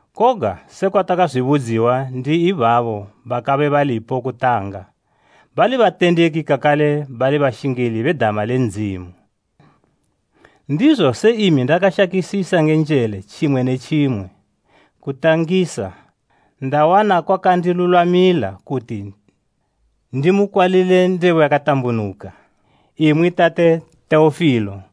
koga sekwa takazwibudziwa ndi ibabo bakabe balipo kutanga, bali batendeki kakale bali bashingili be dama le Ndzimu. Ndizo se imi ndakashakisisa nge njele tjimwe ne tjimwe kudwa mukutangisa, ndawana kwakandilulwamila kuti ndimukukwalile ndebo yakatambunuka, imwi tate Teofilo,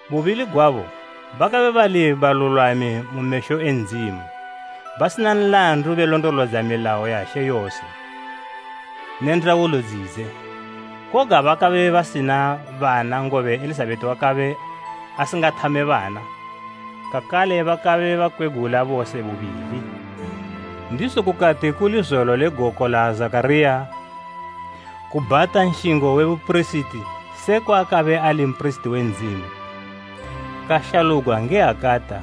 Bubili gwabo, bakabe bali balulwami mu mesho e Ndzimu, basina nlandu belondolodza milayo ya She yose, ne ndaulo dzidze. Koga bakabe basina bana ngobe Elizabeta wakabe asingathame bana, kakale bakabe bakwegula bose bubili. Ndizo kukati kuli zolo le goko la Zakhariya kubhata nshingo we bupirisiti se kwaakabe ali mpirisiti we Ndzimu, kashalugwa nge hakata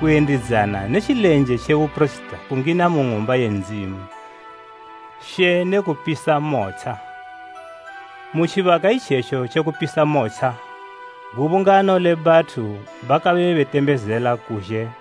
kuyendidzana ne tjilenje tje bupirisiti kungina mu Ng'umba ye Ndzimu She ne kupisa motsha. Mu tjibaka itjetjo tje kupisa motsha, gubungano le bathu lakabe litembezela kuzhe.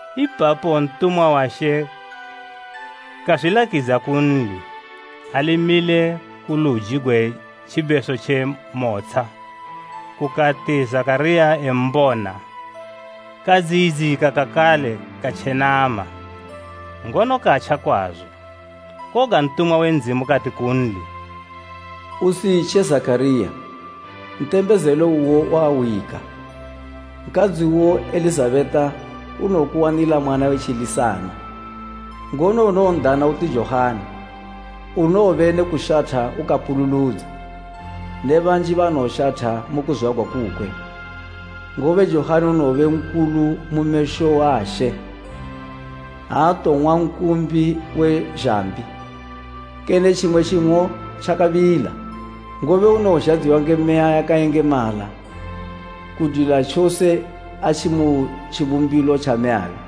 Ipapo ntumwa wa She kazwilakidza kunli, ali mile ku luji gwe tjibeso tje motsha. Kukati Zakhariya embona, kadziyidzika kakale katja kwazo. Koga ntumwa we kudzimu kati kunli, “Usitje Zakhariya, ntembezelo uwo wahwika. Nkadzi uwo Elizabeta unowokuwanila mwana we tjilisana, ngono unowon'dana uti Johani. Unowobe ne kushatha ukapululudza, ne banji banowoshatha mu kuzwagwa kukwe, ngobe Johani unowobe nkulu mu mesho a She. Aatowong'wa nkumbi we zhambi, kene tjimwe tjing'o tjakabila. Ngobe unowozhadziwa nge Meya yakayengemala kudwila tjose atji mu tjibumbilo tja mmeyabe.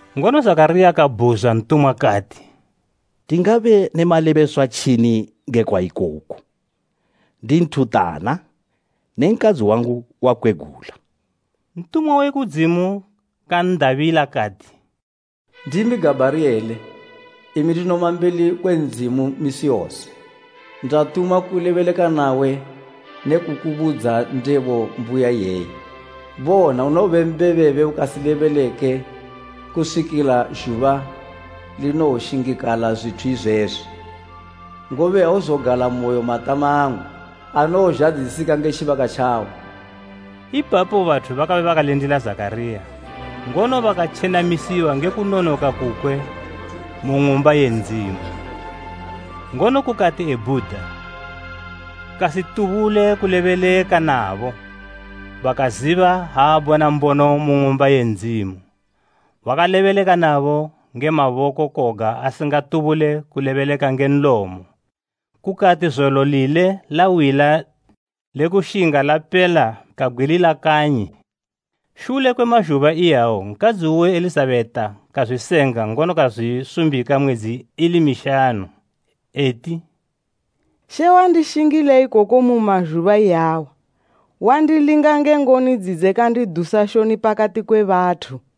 Ngono Zakhariya kabhuzwa ntumwa kati, “Ndingabe ne malebeswa tjini ngekwa ikoku? Ndi nthuntana ne nkadzi wangu wakwegula.” Ntumwa we kudzimu kan'dabila kati, “Ndimi Gabhariyele, imi ndinoma mbeli kwe Ndzimu misi yose. Ndatumwa kulebeleka nawe ne kukubudza ndebo mbuya iyeyi. Bona! Unowobe mbebebe ukasilebeleke kuswikila zhuba linowoshingikala zwithu izwezwi, ngobe auzogalamoyo matama angu anowozhadzisika nge tjibaka tjawo.” Ipapo bathu bakabe bakalindila Zakhariya, ngono bakatjenamisiwa nge kunonoka kukwe mu Ng'umba ye Ndzimu. Ngono kukati ebhuda, kasitubule kulebeleka nabo. Bakaziba ha abona mbono mu Ng'umba ye Ndzimu. Wakalebeleka nabo nge maboko koga asingatubule kulebeleka nge nlomo. Kukati zolo lile lawila le kushinga lapela kabgwilila kanyi. Shule kwe mazhuba iyawo nkadzi uwe Elizabeta kazwisenga ngono kazwisumbika mwedzi ili mishanu, eti “She wandishingila ikoku mu mazhuba iyawa, wandilinga nge ngoni dzidze kandidusa shoni pakati kwe bathu.”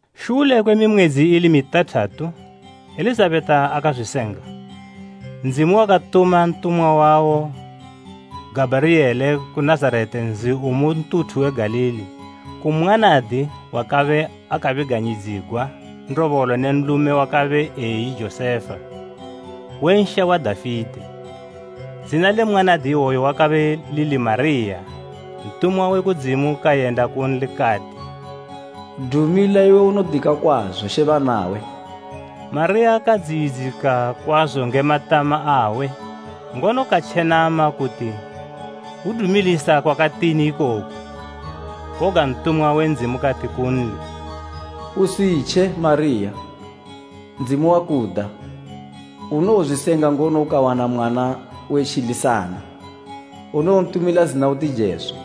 Shule kwe mimwedzi ili mitathatu Elizabeta akazwisenga, Ndzimu wakatuma ntumwa wawo Gabhariyele ku Nazareta nzi u mu ntuthu we Galili ku mwanadi wakabe akabiganyidzigwa ndobolo ne nlume wakabe eyi Josefa, we nsha wa Dafite. Zina le mwanadi iwoyo lakabe lili Mariya. Ntumwa we kudzimu kayenda kunli kati, “Dumila iwe unodika kwazo, She banawe!” Mariya kadziyidzika kwazo nge matama awe, ngono katjenama kuti hwudumilisa kwakatini ikoku. Koga ntumwa we kudzimu kati kunli, “Usitje, Mariya, Ndzimu wakuda. Unowozwisenga, ngono ukawana mwana we tjilisana, unowontumila zina uti Jesu.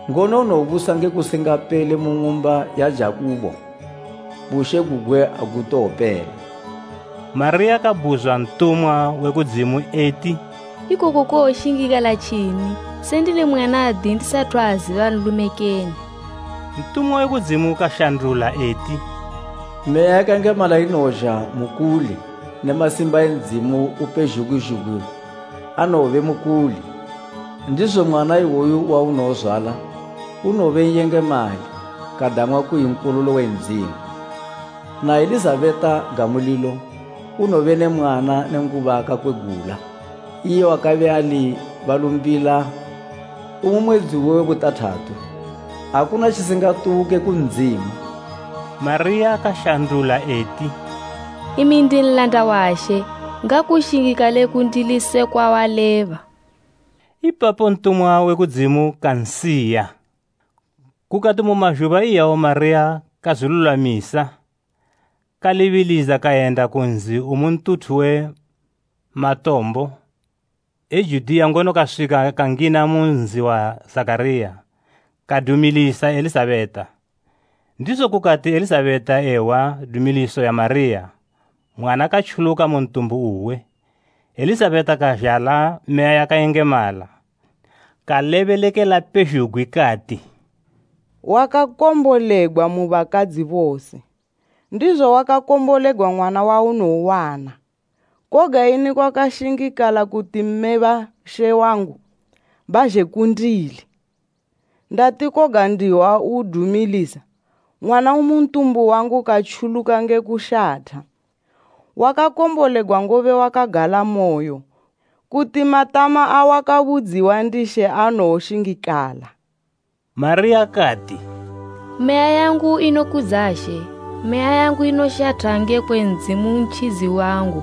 ngono unowobusa nge kusingapele mu ng'umba ya Jakubo, bushe gugwe agutowopela.” Mariya kabhuzwa ntumwa we kudzimu eti, “Ikoku kowoshingikala tjini, se ndili mwanadi ndisathu aziba nlume kene?” Ntumwa we kudzimu kashandula eti, “Meya yakayengemala inowozha mukuli ne masimba e Ndzimu Upezhugwi zhugwi anowobe mukuli. Ndizo mwana iwoyo waunowozwala, unowobe N'yengemali, kadang'wa kuyi Nkololo we Ndzimu. Na Elizabeta gamu lilo, unowobe ne mwana nenguba akakwegula, iye wakabe ali balumbila umu mwedzi uwe we butathatu. Akuna tjisingatubuke ku Ndzimu.” Mariya kashandula eti, “Imi ndi nlanda wa She, ngakushingikale kundili sekwa waleba.” Ipapo ntumwa we kudzimu kansiya. Kukati mu mazhuba iyawo Mariya kazwilulwamisa, kalibilidza kayenda ku nzi umu ntuthu we matombo, e Judiya, ngono kaswika kangina mu nzi wa Zakhariya, kadumilisa Elizabeta. Ndizo kukati Elizabeta ehwa dumiliso ya Mariya, mwana katjuluka mu ntumbu uwe, Elizabeta kazhala Meya yakayengemala. Kalebelekela pezhugwi kati, “Wakakombolegwa mu bakadzi bose, ndizo wakakombolegwa mwana waunowowana! Koga ini kwashingikala kuti mme ba She wangu, bazhe kundili? Ndati koga ndihwa udumilisa, mwana umu ntumbu wangu katjuluka nge kushatha. Wakakombolegwa ngobe wakagalamoyo kuti matama awakabudziwa ndi She anoshingakala!” Mariya kati, “Meya yangu inokudza She. Meya yangu inoshatha ngekwe Ndzimu Ntjidzi wangu,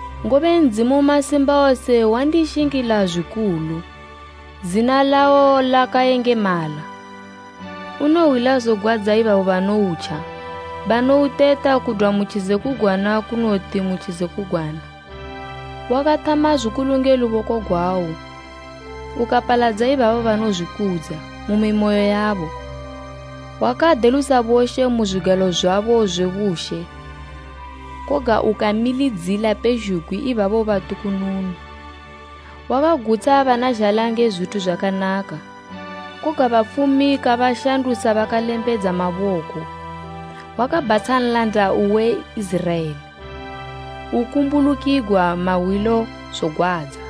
ngobe Ndzimu Masimbawose wandishingila zwikulu. Zina lawo lakayengemala. Unohwila zogwadza ibabo banoutja, banouteta kudwa mu tjizekugwana kunoti mu tjizekugwana. Wakathama zwikulu nge luboko gwawo; Ukapaladza ibabo banozwikudza, mumimoyo yabo. Wakadelusa boshe mu zwigalo zwabo zwe bushe. Koga ukamilidzila pezhugwi ibabo batukununu. Wakagutsha bana zhala nge zwithu zwakanaka, koga bafumi kabashandusa bakalembedza maboko. Wakabhatsha nlanda uwe Iziraela, ukumbulukigwa mahwilo zogwadza,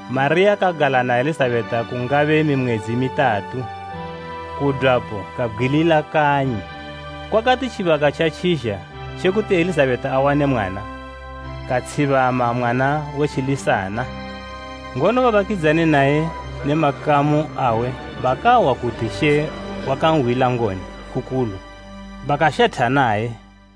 Mariya kagala na Elizabeta kungabe mimwedzi mitatu, kudwapo kabgwilila kanyi. Kwakati tjibaka tjatjizha tje kuti Elizabeta awane mwana, katshibama mwana we tjilisana. Ngono babakidzani naye ne makamu awe bakahwa kuti She wakanhwila ngoni kukulu, bakashatha naye.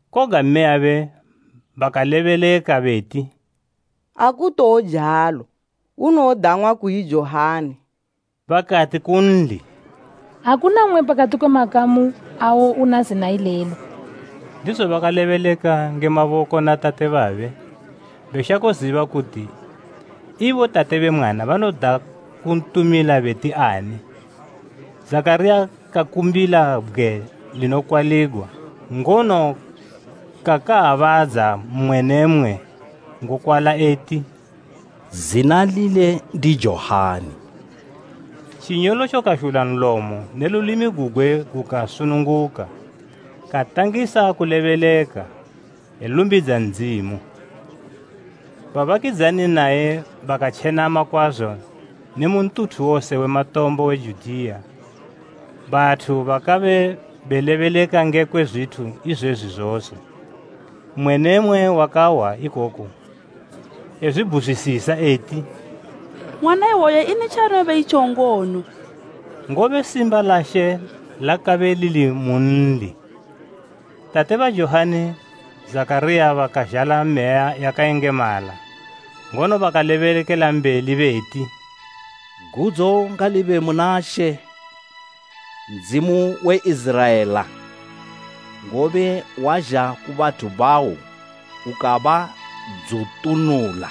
Koga mmeyabe bakalebeleka beti, “Akutowojalo, unowodang'wa kuyi Johani.” Bakati kunli, “Akuna mmwe pakati kwe makamu awo una zina ilelo.” Ndizo bakalebeleka nge maboko na tate babe, beshako ziba kuti ibo tate be mwana banoda kuntumila beti ani. Zakhariya kakumbila bgwe linokwaligwa, ngono kakaabadza mmwe ne mmwe ngokwala eti, “Zina lile ndi Johani.” Tjinyolotjo kazhula nlomo ne lulimi gugwe gukasununguka, katangisa kulebeleka, elumbidza Ndzimu. Babakidzani naye bakatjenama kwazo ne mu ntuthu wose we matombo we Judiya, bathu bakabe belebeleka ngekwe zwithu izwezwi zose. Mmwe ne mmwe wakahwa ikoku ezwibhuzwisisa eti, “Mwana iwoyu ini tjaanowobe itjo ngono?” Ngobe simba la She lakabe lilimunli. Tate ba Johani, Zakhariya bakazhala Meya yakayengemala, ngono bakalebelambeli beti, “Gudzo ngalibe muna She, Ndzimu we Iziraela, ngobe wazha ku bathu bawo ukabadzutunula.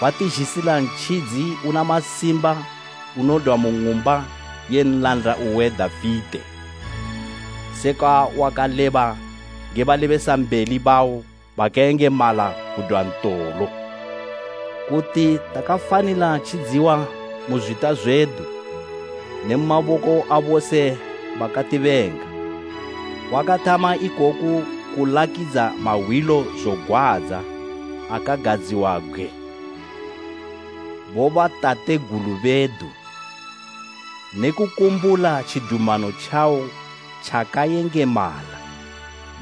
Watizhisila Ntjidzi una masimba unodwa mu ng'umba ye nlanda uwe Dafite. Sekwa wakaleba nge balebesambeli bawo bakayengemala kudwa ntolo, kuti takafanila tjidziwa mu zwita zwedu, ne mu maboko abose bakatibenga. Wakathama ikoku kulakidza mahwilo zogwadza akagadziwabgwe bobatategulu bedu, ne kukumbula tjidumano tjawo tjakayengemala,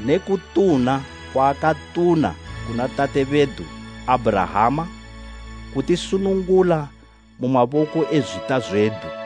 ne kutuna kwawakatuna kuna tate bedu Abhurahama, kutisunungula mu maboko e zwita zwedu,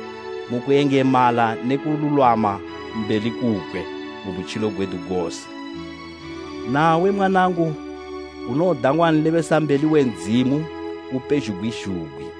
mu kuyengemala ne kululwama mbeli kukwe, mu butjilo gwedu gose. Nawe mwanangu, unowodang'wa nlebesambeli we Ndzimu Upezhugwi zhugwi,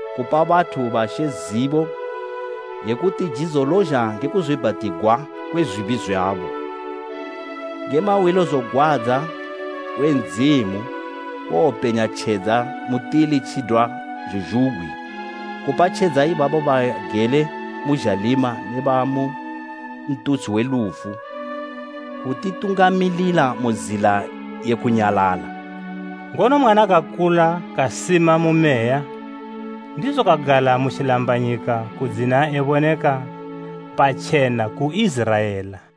kupa bathu ba She zibo ye kuti jidzo lozha nge kuzwiibhatigwa kwe zwibi zwabo, nge mahwilo zogwadza e Ndzimu kowopenya tjedza mutili tjidwa zhuzhugwi. Kupa tjedza ibabo bagele mu zhalima ne bamu ntutshi we lufu, kutitungamilila mu zila ye kunyalala.” Ngono mwana kakula kasima mu meya, ndizo kagala mu tjilambanyika kudzina eboneka patjena ku Iziraela.